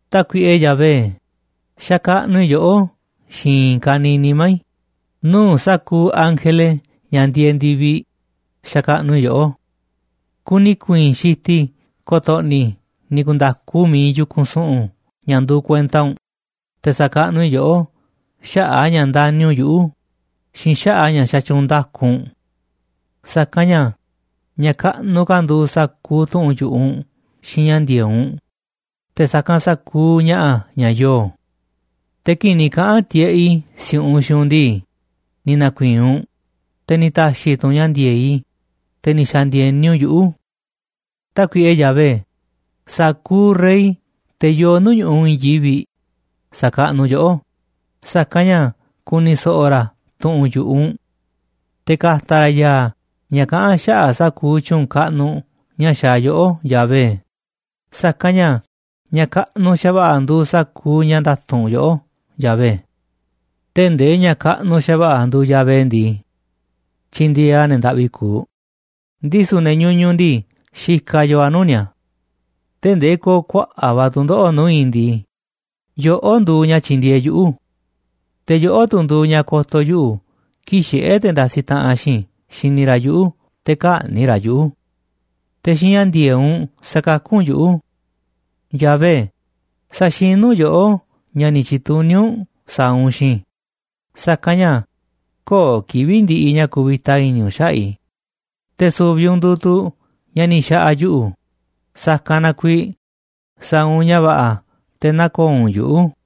Tákuiꞌe Yahvé, xakaꞌnuꞌ i̱ yoꞌó xiinꞌ i̱i̱n ka̱niiꞌ nimá i̱. Nuu̱ꞌ sa̱kuuꞌ ángele ña̱ ndieeꞌ ndi̱viꞌ xakaꞌnuꞌ i̱ yoꞌó. Kuni i̱ ku̱i̱i̱n xitiꞌ i̱ ko̱to̱ꞌni̱ i̱ ni̱ ku̱nda̱ku miiꞌ iinꞌ yu̱kunꞌ su̱ꞌu̱n ña̱ nduuꞌ kuenta u̱nꞌ, te̱ sa̱kaꞌnuꞌ i̱ yoꞌó xaꞌa̱ꞌ a̱ ña̱ ndani̱ u̱nꞌ yuꞌu̱ xiinꞌ xaꞌa̱ꞌ a̱ ña̱ xatyuunꞌ nda̱ku u̱nꞌ. Sa̱kanꞌ ña̱ ña̱ kaꞌnuꞌ ka̱ nduuꞌ sa̱kuuꞌ tu̱ꞌu̱n yu̱ꞌuꞌ u̱nꞌ xiinꞌ ña̱ ndi̱e̱eꞌ u̱nꞌ, te̱ sa̱kanꞌ sa̱kuuꞌ ña̱ꞌa̱ ña̱ yoo. Te̱ kii̱ꞌ ni̱ kaꞌa̱n tiꞌeꞌ i̱ si̱u̱ꞌunꞌ xiinꞌ u̱nꞌ ndii, ni̱ na̱ku̱i̱i̱n u̱nꞌ, te̱ ni̱ ta̱xi̱ tu̱ u̱nꞌ ña̱ ndi̱e̱eꞌ i̱, te̱ ni̱ xa̱ndi̱e̱ni u̱nꞌ yuꞌu̱. Tákuiꞌe Yahvé, sa̱kuuꞌ rey, te̱ yoo nuu̱ꞌ ñu̱ꞌuꞌ i̱i̱n yivi̱ꞌ, sa̱kaꞌnuꞌ yoꞌó, sa̱kanꞌ ña̱ ku̱ni̱ so̱ꞌo̱ ra̱ tu̱ꞌu̱n yu̱ꞌuꞌ u̱nꞌ. Te̱ ka̱ta̱ ra̱ ya̱a̱ ña̱ kaꞌán xaꞌa̱ꞌ sa̱kuuꞌ tyu̱u̱n kaꞌnuꞌ ña̱ xaaꞌ yoꞌó, Yahvé, sa̱kanꞌ ña̱ ña̱ kaꞌnuꞌ xa̱va̱ꞌa̱ nduuꞌ sa̱kuuꞌ ña̱ nda̱tu̱nꞌ yoꞌó, Yahvé. Tee̱ꞌ ndee ña̱ kaꞌnuꞌ xa̱va̱ꞌa̱ nduuꞌ Yahvé ndii, tyindieeꞌ a̱ ne̱ ndaꞌvi kuuꞌ, ndisu̱ ne̱ ñuñuꞌ ndii, xikaꞌ yoo a̱ nuu̱ꞌ ni̱a̱. Tee̱ꞌ ndee ko̱o̱ kuaꞌa̱ꞌ va̱ tu̱ndoꞌo̱ꞌ nuu̱ꞌ i̱ ndii, yoꞌó nduuꞌ ña̱ tyi̱ndi̱e̱eꞌ yuꞌu̱, te̱ yoꞌó tu̱ nduuꞌ ña̱ ko̱to̱ yuꞌu̱ kii̱ꞌ xiꞌé te̱ ndasiꞌ taꞌanꞌ xiinꞌ i̱ xini ra̱ yuꞌu̱, te̱ kä̱ꞌni̱ꞌ ra̱ yuꞌu̱. Te̱ xiinꞌ ña̱ ndi̱e̱eꞌ u̱nꞌ sa̱kakú u̱nꞌ yuꞌu̱. Yahvé, sa̱xinú yoꞌó ña̱ ni̱ tyi̱tuní u̱nꞌ sa̱a̱ u̱nꞌ xiinꞌ i̱, sa̱kanꞌ ña̱ köo̱ꞌ kivi̱ꞌ ndiꞌiꞌ ña̱ kuvita i̱ni̱ u̱nꞌ xaꞌa̱ꞌ i̱, te̱ su̱vi̱ u̱nꞌ nduuꞌ tu̱ ña̱ ni̱ xa̱ꞌa̱ yuꞌu̱, sa̱kanꞌ na kuiiꞌ sa̱a̱ u̱nꞌ ña̱ va̱ꞌa̱, te̱ nä̱ko̱o̱ u̱nꞌ yuꞌu̱.